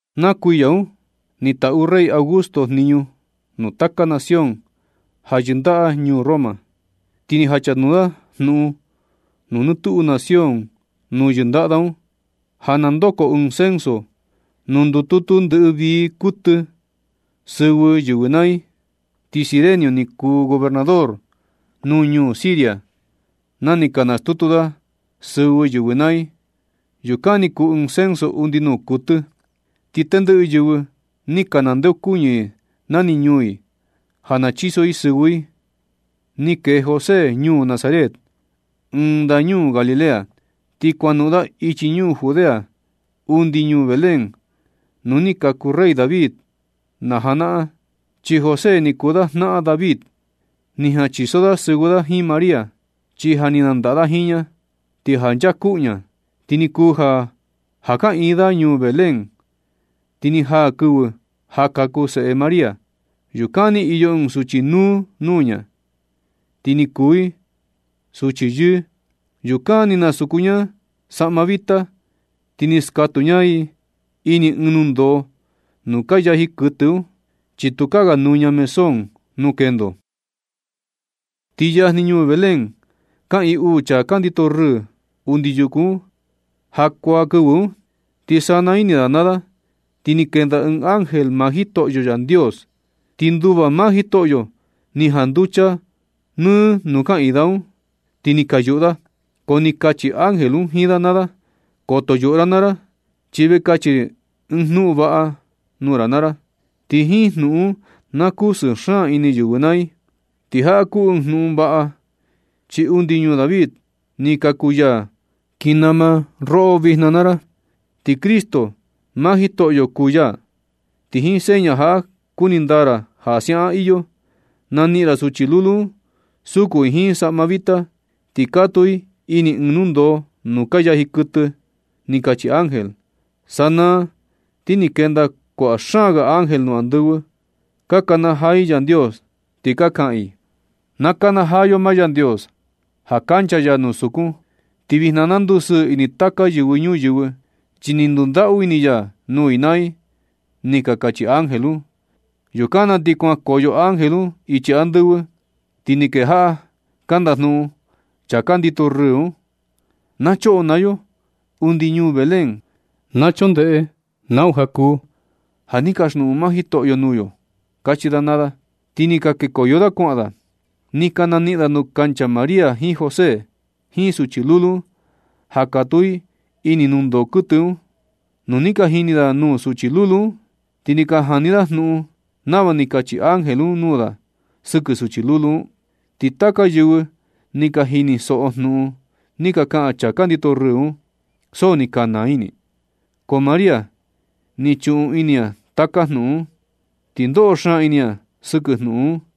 Na kuiya un ni taꞌu rey Augusto jniñu nuu taka nación ja yɨndaꞌa ñuu Roma, ti ni jachanuu da jnuꞌun nuu nɨ tuꞌu nación nuu yɨndaꞌa da un, ja na ndoko ɨɨn censo nuu ndututu ndɨꞌɨ vii kuɨtɨ sɨvɨ yɨvɨ naa i. Ti Cirenio ni kuu gobernador nuu ñuu Siria na ni ka nastutu da sɨvɨ yɨvɨ naa i. Yukan ni kuu ɨɨn censo undi nuu kuɨtɨ. Ti tendɨꞌɨ yɨvɨ ni ka nandeokuñɨ i nani ñuu i, ja na chiso i sɨvɨ i un. Ni kee José ñuu Nazaret, ɨɨn ndañuu Galilea, ti kuanoꞌon da ichi ñuu Judea undi ñuu Belén nuu ni kaku rey David na janaꞌan, chi José ni kuu da jnaꞌan David. Ni jan chiso da sɨvɨ da jiin María, chi ja ni nandaꞌa da jiin ña, ti ja nchaa kuꞌu ña. Ti ni kuu ja, ja kaꞌiin da ñuu Belén, ti ni jaa kɨvɨ ja kaku seꞌe María. Yukan ni iyo ɨɨn suchi núú nuu ña, ti ni kuu i suchi yɨɨ. Yukan ni nasuku ña i saꞌma vita, ti ni skatuu ña i ini ɨɨn nundoo nuu ka yaji kɨtɨ un, chi tukaa ga nuña mesón nuu kendo. Ti yajni ñuu Belén kaꞌiin uu chaa ka ndito rɨɨ undi yuku un jakuaa kɨvɨ un. Ti sana ini da naa da, ti ni kenda ɨɨn ángel maa Jitoꞌyo Yandios, ti nduva maa Jitoꞌyo ni janducha nɨ nuu kaꞌiin da un, ti ni ka yuꞌu da. Ko ni kachi ángel un jiin da naa da: ―Koto yuꞌu ra naa ra, chi ve kachi ri ɨɨn jnuꞌun vaꞌa nuu ra naa ra, ti jiin jnuꞌun un na kusɨɨ xaan ini yɨvɨ naa i. Ti jaꞌa kuu ɨɨn jnuꞌun vaꞌa, chi undi ñuu David ni kaku ya kii nama roꞌo vijna naa ra, ti Cristo maa Jitoꞌyo kuu ya. Ti jiin seña jaꞌa kuni ndaa ra ja siaꞌan iyo, naniꞌin ra suchi lulu un suku i jiin saꞌma vita, ti katuu i ini ɨɨn nundoo nuu ka yaji kɨtɨ ―ni kachi ángel. Sanaa ni ti ni kenda kuaꞌa xaan ga ángel nuu andɨvɨ, ka kanajaa i Yandios, ti ka kaꞌan i: ―¡Na nakanajaa yo maa Yandios ja kancha ya nuu sukun! Ti vijna na ndusɨɨ ini taka yɨvɨ ñuyɨvɨ, chi ni ndundaꞌu ini ya nuu i naa i ―ni ka kachi ángel un. Yukan na ti nu kuan nukoyo ángel un ichi andɨvɨ, ti ni kejaꞌa ka ndajnuꞌun chaa ka ndito rɨɨ un: ―Na choꞌo naa yo undi ñuu Belén, na choꞌo ndeꞌe nau ja kuu ja ni kasjnuꞌun maa Jitoꞌyo nuu yo ―kachi da naa da. Ti ni ka kekoyo da kuaꞌan da, ni ka naniꞌin da nuu kancha María jiin José jiin suchi lulu un ja katuu i ini nundoo kɨtɨ un. Nu ni ka jini da nuu suchi lulu un, ni ka jani da jnuꞌun nava ni kachi ángel un nuu da sɨkɨ suchi lulu un. Ti taka yɨvɨ ni ka jinisoꞌo jnuꞌun ni ka kaꞌan chaa ka ndito rɨɨ un, so ni ka naa ini i. Ko María ni chuꞌun ini ña taka jnuꞌun un, ti ndoꞌo xaan ini ña sɨkɨ jnuꞌun un.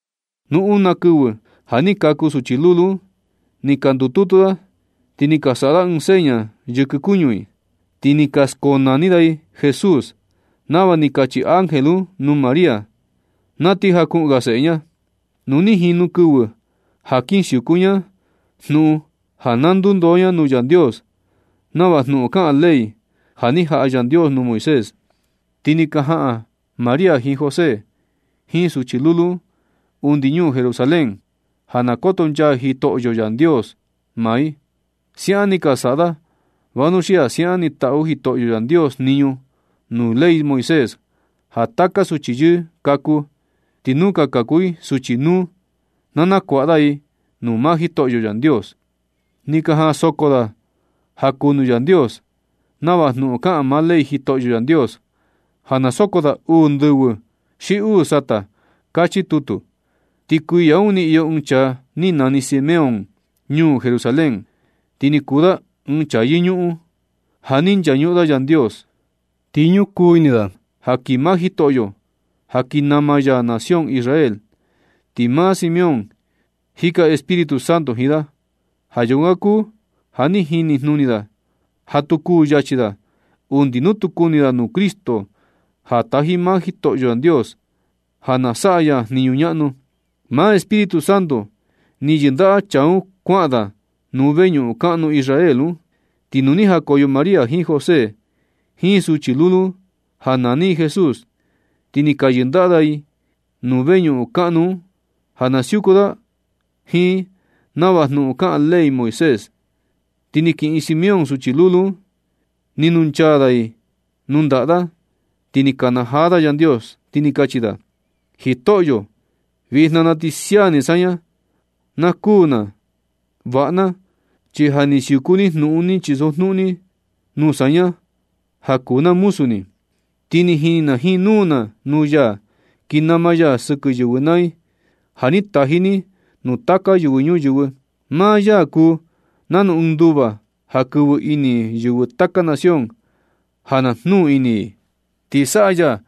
Nu una kɨvɨ ja ni kaku suchi lulu un, ni ka ndututu da, ti ni ka saꞌa da ɨɨn seña yɨkɨ kuñu i, ti ni ka skonani da i Jesús, nava ni kachi ángel un nuu María, na ti jakuꞌun ga seꞌe ña. Nu ni jinu kɨvɨ ja kin siuku ña jnuꞌun ja na ndundoo ña nuu Yandios nava jnuꞌun kaꞌan ley, ja ni jaꞌa Yandios nuu Moisés. Ti ni ka jaꞌan María jiin José jiin suchi lulu un undi ñuu Jerusalén ja na kotonchaa Jitoꞌyo Yandios maa i. Siaꞌan ni ka saꞌa da, vanuxia siaꞌan ni taꞌu Jitoꞌyo Yandios jniñu nuu ley Moisés ja taka suchi yɨɨ kaku, ti nu ka kuu i suchi núú, na nakuaꞌa da i nuu maa Jitoꞌyo Yandios. Ni ka jaꞌan soko da ja kuu nuu Yandios nava jnuꞌun kaꞌan maa ley Jitoꞌyo Yandios, ja na soko da uu ndɨvɨ xi uu sata, kachi tutu. Ti kuiya un ni iyo ɨɨn chaa ni nani Simeón ñuu Jerusalén, ti ni kuu da ɨɨn chaa yɨñuꞌun, ja ni nchañuꞌun da Yandios. Ti ñukuu ini da ja kii maa Jitoꞌyo ja kii nama ya nación Israel. Ti maa Simeón, jika Espíritu Santo jiin da. Ja yukan kuu ja ni jini jnuni da ja tu kuu yachi da undi nu tu kuni da nuu Cristo, ja taji maa Jitoꞌyo Yandios ja na saꞌa ya jniñu ñaꞌnu. Maa Espíritu Santo ni yɨndaꞌa chaa un kuaꞌan da nuu veñuꞌun kaꞌnu Israel un. Ti nu ni jakoyo María jiin José jiin suchi lulu un ja nani i Jesús, ti ni ka yɨndaꞌa da i nuu veñuꞌun kaꞌnu un ja na siuku da jiin i nava jnuꞌun kaꞌan ley Moisés. Ti ni kiꞌin Simeón suchi lulu un, ni nunchaa da i nuu ndaꞌa da, ti ni kanajaa da Yandios, ti ni kachi da: Jitoꞌyo, vijna na ti sia ni saña, na kuū na vaꞌa na, chi ja ni siuku ni jnuꞌun ni chisojnuꞌun ni nuu saña ja kuu na muzu ni. Ti ni jini na jiin nuu na nuu ya, kii nama ya sɨkɨ yɨvɨ naa i, ja ni taji ni nuu taka yɨvɨ ñuyɨvɨ. Maa ya kuu nanu ɨɨn nduva ja kɨvɨ ini yɨvɨ taka nación ja na jnuu ini i. Ti saꞌa ya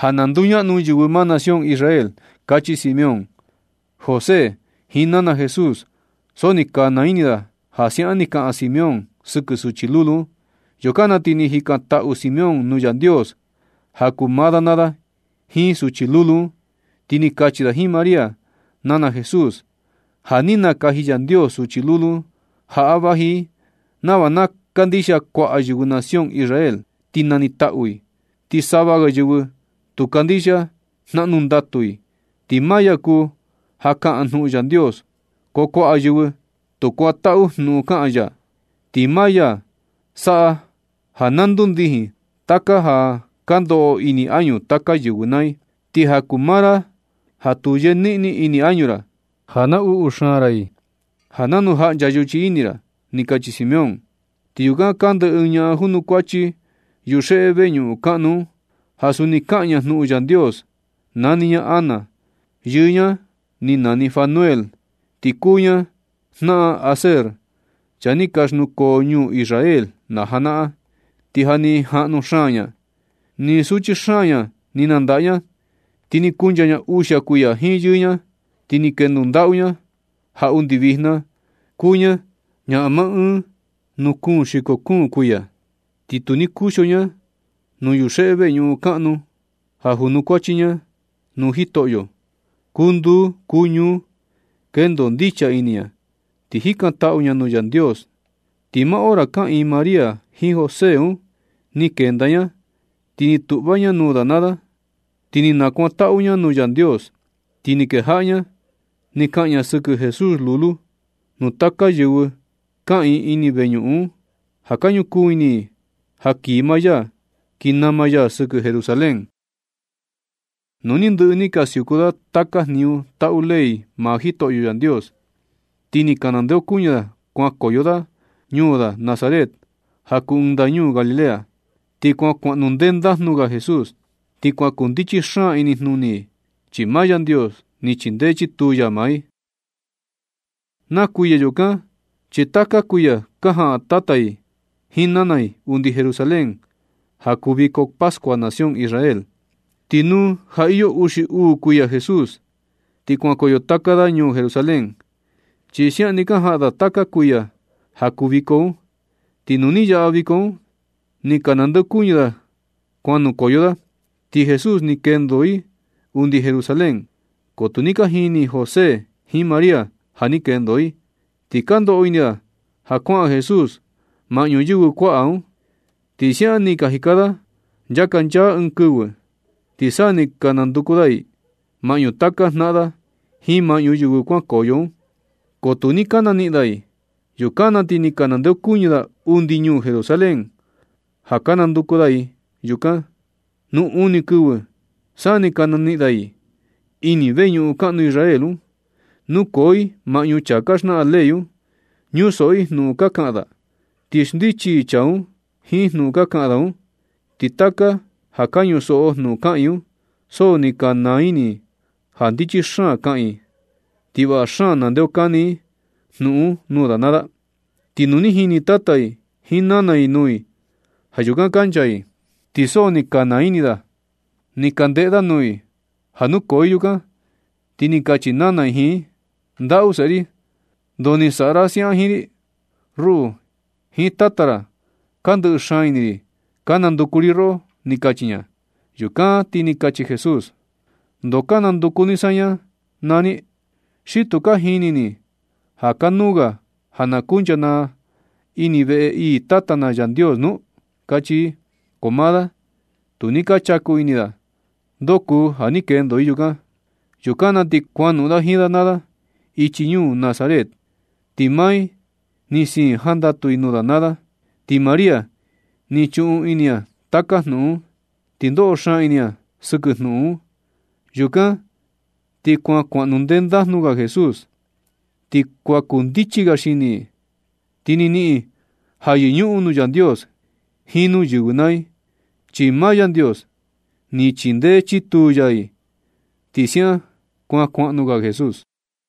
ja na nduñaꞌnu yɨvɨ maa nación Israel. Kachi Simeón. José jiin nana Jesús, so ni ka naa ini da ja siaꞌan ni kaꞌan Simeón sɨkɨ suchi lulu un. Yukan na ti ni jikantaꞌu Simeón nuu Yandios ja kuu maa da naa da jiin suchi lulu un, ti ni kachi da jiin María, nana Jesús: ―Ja ni nakaji Yandios suchi lulu jaꞌa vaji i nava na kandixia kuaꞌa yɨvɨ nación Israel, ti nanitaꞌu i. Ti sava ga yɨvɨ tu kandixia, jnaꞌnu ndatu i. Ti maa ya kuu ja kaꞌan jnuꞌun Yandios, ko kuaꞌa yɨvɨ tu kuantaꞌu jnuꞌun kaꞌan ya. Ti maa ya saꞌa ja na ndundijin taka ja ka ndoꞌo ini añu taka yɨvɨ naa i. Ti ja kuu maa ra jatu yeniꞌni ini añu ra, ja naꞌnu xaan ra i, ja nanu jaꞌncha yuchi ini ra ―ni kachi Simeón. Ti yukan kande ɨɨn ñaꞌan junukuachi yuxeꞌe veñuꞌun kaꞌnu un, ja suni kaꞌan ña jnuꞌun Yandios. Nani ña Ana. Yɨɨ ña ni nani Fanuel, ti kuu ña jnaꞌan Aser, chaa ni ka xnukoo ñuu Israel na janaꞌan. Ti ja ni jaꞌnu xaan ña. Nɨ suchi xaan ña ni nandaꞌa ña, ti ni kuncha ña uxia kuiya jiin yɨɨ ña, ti ni kendo ndaꞌu ña ja undi vijna kuu ña ñaꞌan maa un nuu kuun xiko kuun kuiya. Ti tu kuxio ña nuu yuxeꞌe veñuꞌun kaꞌnu un ja junukuachi ña nuu Jitoꞌyo kuu nduu kuu ñuu, kendo ndicha ini ña, ti jikantaꞌu ña nuu Yandios. Ti maa hora kaꞌiin María jiin José un ni kenda ña ni tuꞌva ña nuu da naa da, ti ni nakuantaꞌu ña nuu Yandios. Ti ni kejaꞌa ña ni kaꞌan ña sɨkɨ Jesús lulu nuu taka yɨvɨ kaꞌiin ini veñuꞌun un, ja ka ñukuu ini i ja kii maa ya kii nama ya sɨkɨ Jerusalén. Nu ni ndɨꞌɨ ni ka siuku da taka jniñu taꞌu ley maa Jitoꞌyo Yandios, ti ni ka nandeokuñɨ da kuan nukoyo da ñuu da Nazaret ja kuu ɨɨn ndañuu Galilea. Ti kuan kuaꞌnu ndendajnu ga Jesús, ti kuan kuu ndichi xaan inijnuni i, chi maa Yandios ni chindee chituu ya maa i. Na kuiya yukan chi taka kuiya ka jaꞌan tata i jiin nana i undi Jerusalén, ja kuu viko pascua nación Israel. Ti nu ja iyo uxi uu kuiya Jesús, ti kuankoyo taka da ñuu Jerusalén, chi siaꞌan ni ka jaꞌan da taka kuiya ja kuu viko un. Ti nu ni yaꞌa viko un, ni ka nandeokuñɨ da kuan nukoyo da. Ti Jesús ni kendo i undi Jerusalén, ko tu ni ka jini José jiin María ja ni kendo i. Ti ka ndoꞌo ini da ja kuaꞌan Jesús maꞌñu yɨvɨ kuaꞌa un, ti siaꞌan ni ka jika da nchakanchaa ɨɨn kɨvɨ. Ti sa ni ka nanduku da i maꞌñu taka jnaꞌan da jiin maꞌñu yɨvɨ kuankoyo un, ko tu ni ka naniꞌin da i. Yukan na ti ni ka nandeokuñɨ da undi ñuu Jerusalén, ja ka nanduku da i yukan. Nu uni kɨvɨ sa ni ka naniꞌin da i ini veñuꞌun kaꞌnu Israel un, nukoo i maꞌñu chaa ka xnaꞌan ley un, ñusoꞌo i jnuꞌun ka kaꞌan da, ti xndichi i chaa un jiin jnuꞌun ka kaꞌan da un. Ti taka ja ka ñusoꞌo jnuꞌun kaꞌan i, so ni ka naa ini ja ndichi xaan kaꞌan i, ti vaꞌa xaan naxndeokani i jnuꞌun un nuu da naa da. Ti nu ni jini tata i jiin nana i nuu i ja yukan kancha i, ti so ni ka naa ini da ni ka ndeꞌe da nuu i ja nukoo i yukan. Ti ni kachi nana i jiin i: ―Ndaꞌu seꞌe ri. ¿Ndoo ni saꞌa ra siaꞌan jiin ri? Ruꞌu jiin tata ra ka ndɨꞌɨ xaan ini ri ka nanduku ri roꞌo ―ni kachi ña. Yukan na ti ni kachi Jesús: ―¿Ndoo ka nanduku ni saña naa ni? ¿Xi tu ka jini ni ja kanuu ga ja na kunchaa na ini veꞌe ii Tata na Yandios nu? ―kachi i. Ko maa da, tu ni ka chaku ini da ndoo kuu ja ni kendo i yukan. Yukan na ti kuanoꞌon i jiin da naa da ichi ñuu Nazaret, ti maa i ni siin i jandatu i nuu da naa da. Ti María ni chuꞌun ini ña taka jnuꞌun un, ti ndoꞌo xaan ini ña sɨkɨ jnuꞌun un. Yukan ti kuan kuaꞌnu ndendajnu ga Jesús, ti kuan kundichi ga xini i. Ti ni niꞌin i ja yɨñuꞌun nuu Yandios jiin nuu yɨvɨ naa i, chi maa Yandios ni chindee chituu ya i. Ti siaꞌan kuan kuaꞌnu ga Jesús.